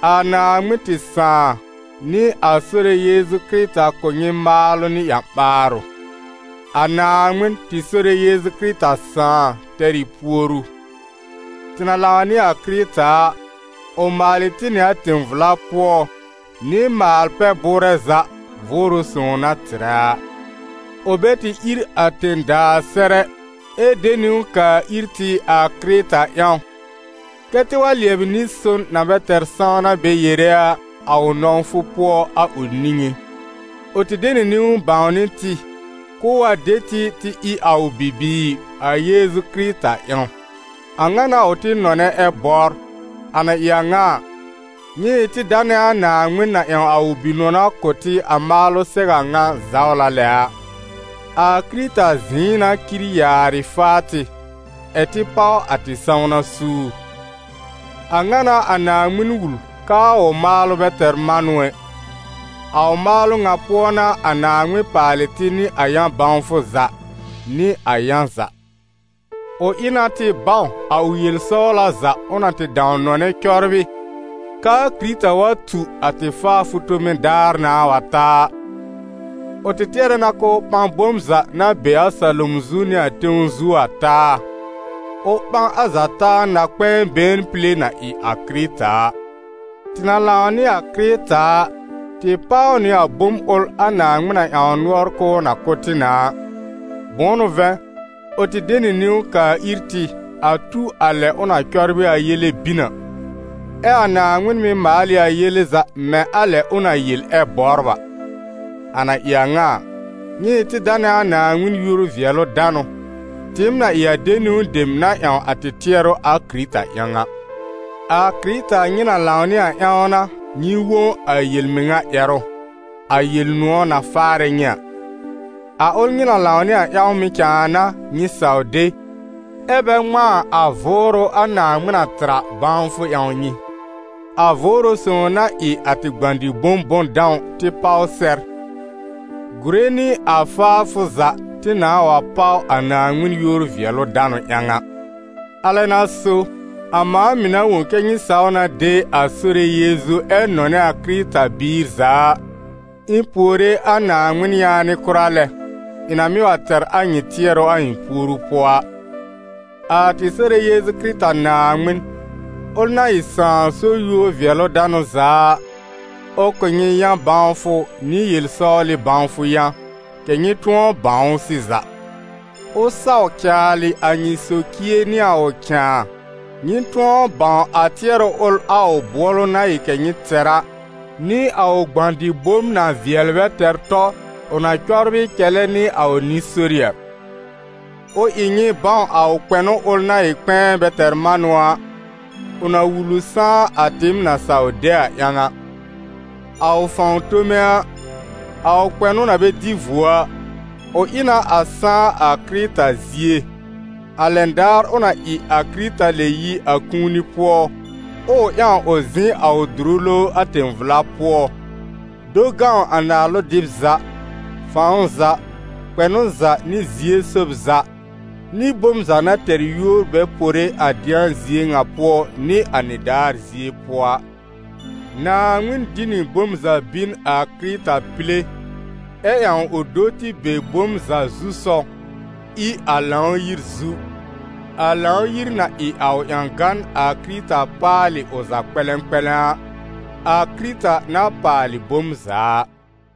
A Naaŋmɩn tɩ Sãà nɩ a Sore Yeezu Kɩrɩta kʋ̀ nyɩ maalʋ nɩ ƴã-ɓaarʋ. A Naaŋmɩn, tɩ Sore Yeezu Kɩrɩta Sãà, tɛr ɩ puoru. Tɩ na lãw nɩ a Kɩrɩta a, ʋ maalɩ tɩ nɩ a tẽ-vla pʋɔ, nɩ maal-pɛ-bʋʋrɛ za Vʋʋrʋ Sõw na tɩrɛ a. Ʋ bɛ tɩ ír a tẽ-daa sɛr ɛ, ɛ de niwn kaa ir tɩ a Kɩrɩta ƴãw, kɛ́ tɩ wa lɩɛbɩ nɩ-son na bɛ tɛr sãwna bɛ yere a, a ʋ nɔ̃wfʋ pʋɔ, a ʋ niŋé. Ʋ tɩ de nɩ niwn bãwnɩ tɩ, k'ʋʋ wa de tɩ tɩ ɩ a ʋ bibiir a Yeezu Kɩrɩta ƴãw. A ŋa n'a ʋ tɩ nɔnɛ ɛ bɔbr. A na ɩ a ŋa a, nyɩ ɩ tɩ danɛ a Naaŋmɩn na ƴãw a ʋ Bi-nɔna kʋ̀ tɩ a maalʋ sɛw a ŋa zawla lɛ a. A Kɩrɩta zɩ̃ɩ n'a cir yaarɩ faa tɩ, ɛ̀ tɩ páw a tɩ sãwna suur. A ŋa n'a a Naaŋmɩn wul k'aa ʋ maalʋ bɛ tɛr manʋ ɛ. A ʋ maalʋ ŋa pʋɔ n'a a Naaŋmɩn paalɩ tɩ nɩ a yã-bãwfʋ za, nɩ a yã za: ʋ ɩ na tɩ bãw a ʋ yel-sɔwla za ʋ na tɩ dãw nɔnɛ cɔbrɩ, k'aa Kɩrɩta wa tu a tɩ faafʋ tome daar nãà wa ta a. Ʋ tɩ tɩɛrɛ na k'ʋʋ ɓã bom za na be a salom zu nɩ tẽw zu a taa, ʋ ɓã a za taa na-kpɛ̃ɛ been pile na ɩ a Kɩrɩta a. Tɩ na lãw nɩ a Kɩrɩta a, tɩ páw nɩ a bom ʋl a Naaŋmɩn na ƴãw nʋɔr k'ʋʋ na kʋ̀ tɩ na a: bʋ̃ʋ n'ʋ vɛ̃, ʋ tɩ de nɩ niwn kaa ir tɩ a tu a lɛ ʋ na cɔbrɩ a yele bin a; ɛ a Naaŋmɩn mɩ́ maal ɩ a yele za mɛ̃ a lɛ ʋ na yel ɛ bɔbr a. A na ɩ a ŋa a, nyɩ ɩ tɩ danɛ a Naaŋmɩn yúor-vɩɛlʋ-danʋ, tɩɩm na ɩ a de niwn dem na ƴãw a tɩ tɩɛrʋ a Kɩrɩta ƴãw a. A Kɩrɩta nyɩ na lãw nɩ a ƴãw n'a nyɩ wõ a yel-mɩŋa ƴɛrʋ, a Yel-nʋ̃ɔ̀ na faarɛ nyɩ a. A ʋl nyɩ na lãw nɩ a ƴãw mɩ̀ cãa n'a nyɩ saw de, ɛ́ bɛ ŋmãa a Vʋʋrʋ a Naaŋmɩn na tɩr a bãwfʋ ƴãw nyɩ, a Vʋʋrʋ Sõw na ɩ a tɩ gbã-dɩ-bom bʋ̃-dãw tɩ páw sɛr, gùre nɩ a faafʋ za tɩ nãà wa páw a Naaŋmɩn yúor-vɩɛlʋ-danʋ ƴãw a. Alɛ n'a so, a mãa mɩ̀ na wõ kɛ́ nyɩ saw na de a Sore Yeezu ɛ nɔnɛ a Kɩrɩta-biir za a, ɩ̃ puore a Naaŋmɩn yaanɩ kʋra lɛ, ɩ̃ na mɩ́ wa tɛr a nyɩ tɩɛrʋ a ɩ̃ puoru pʋɔ a. A tɩ Sore Yeezu Kɩrɩta Naaŋmɩn, ʋl na ɩ Sãà so yúor-vɩɛlʋ-danʋ za a, ʋ kʋ̀ nyɩ yã-bãwfʋ nɩ yel-sɔwlɩ bãwfʋ yã, kɛ̀ nyɩ tʋ̃ɔ bãw ʋ sɩza. Ʋ saw caalɩ a nyɩ socie nɩ a ʋ cãa, nyɩ tʋ̃ɔ bãw a tɩɛrʋ ʋl a ʋ bʋɔlʋ na ɩ kɛ nyɩ tɛr a, nɩ a ʋ gbã-dɩ-bom na vɩɛl bɛ tɛr tɔ, ʋ na cɔbrɩ cɛlɛ nɩ a ʋ nɩ-sori a. Ʋ ɩ nyɩ bãw a ʋ kpɛnʋ ʋl na ɩ kpɛ̃ɛ bɛ tɛr manʋ a, ʋ na wul ʋ sãá a tɩɩm na saw de a ƴãw a. A ʋ fãw tome a, a ʋ kpɛnʋ na bɛ dɩ vuo a, ʋ ɩ na a sãá a Kɩrɩta zie, a lɛn daar ʋ na ɩ a Kɩrɩta lɛb yi a kũuni pʋɔ, ɛ ʋ ƴãw ʋ zɩ̃ a ʋ dʋrʋ lowr a tẽ-vla pʋɔ, do gãw a naalʋ-dɩb za, fãw za, kpɛnʋ za nɩ zie-sób za, nɩ bom za na tɛr yúor bɛ pore a dɩ̃a zie ŋa pʋɔ nɩ a nɩdaar zie pʋɔ a. Naaŋmɩn dĩ nɩ bom za bìn a Kɩrɩta pile, ɛ ƴãw ʋ do tɩ be bom za zu-sɔw, ɩ a Lãw-yir zu, a Lãw-yir na ɩ a ʋ ƴãgan a Kɩrɩta paalɩ ʋ za kpɛ̃lɛ̃kpɛ̃lɛ̃ a, a Kɩrɩta na paalɩ bom za a.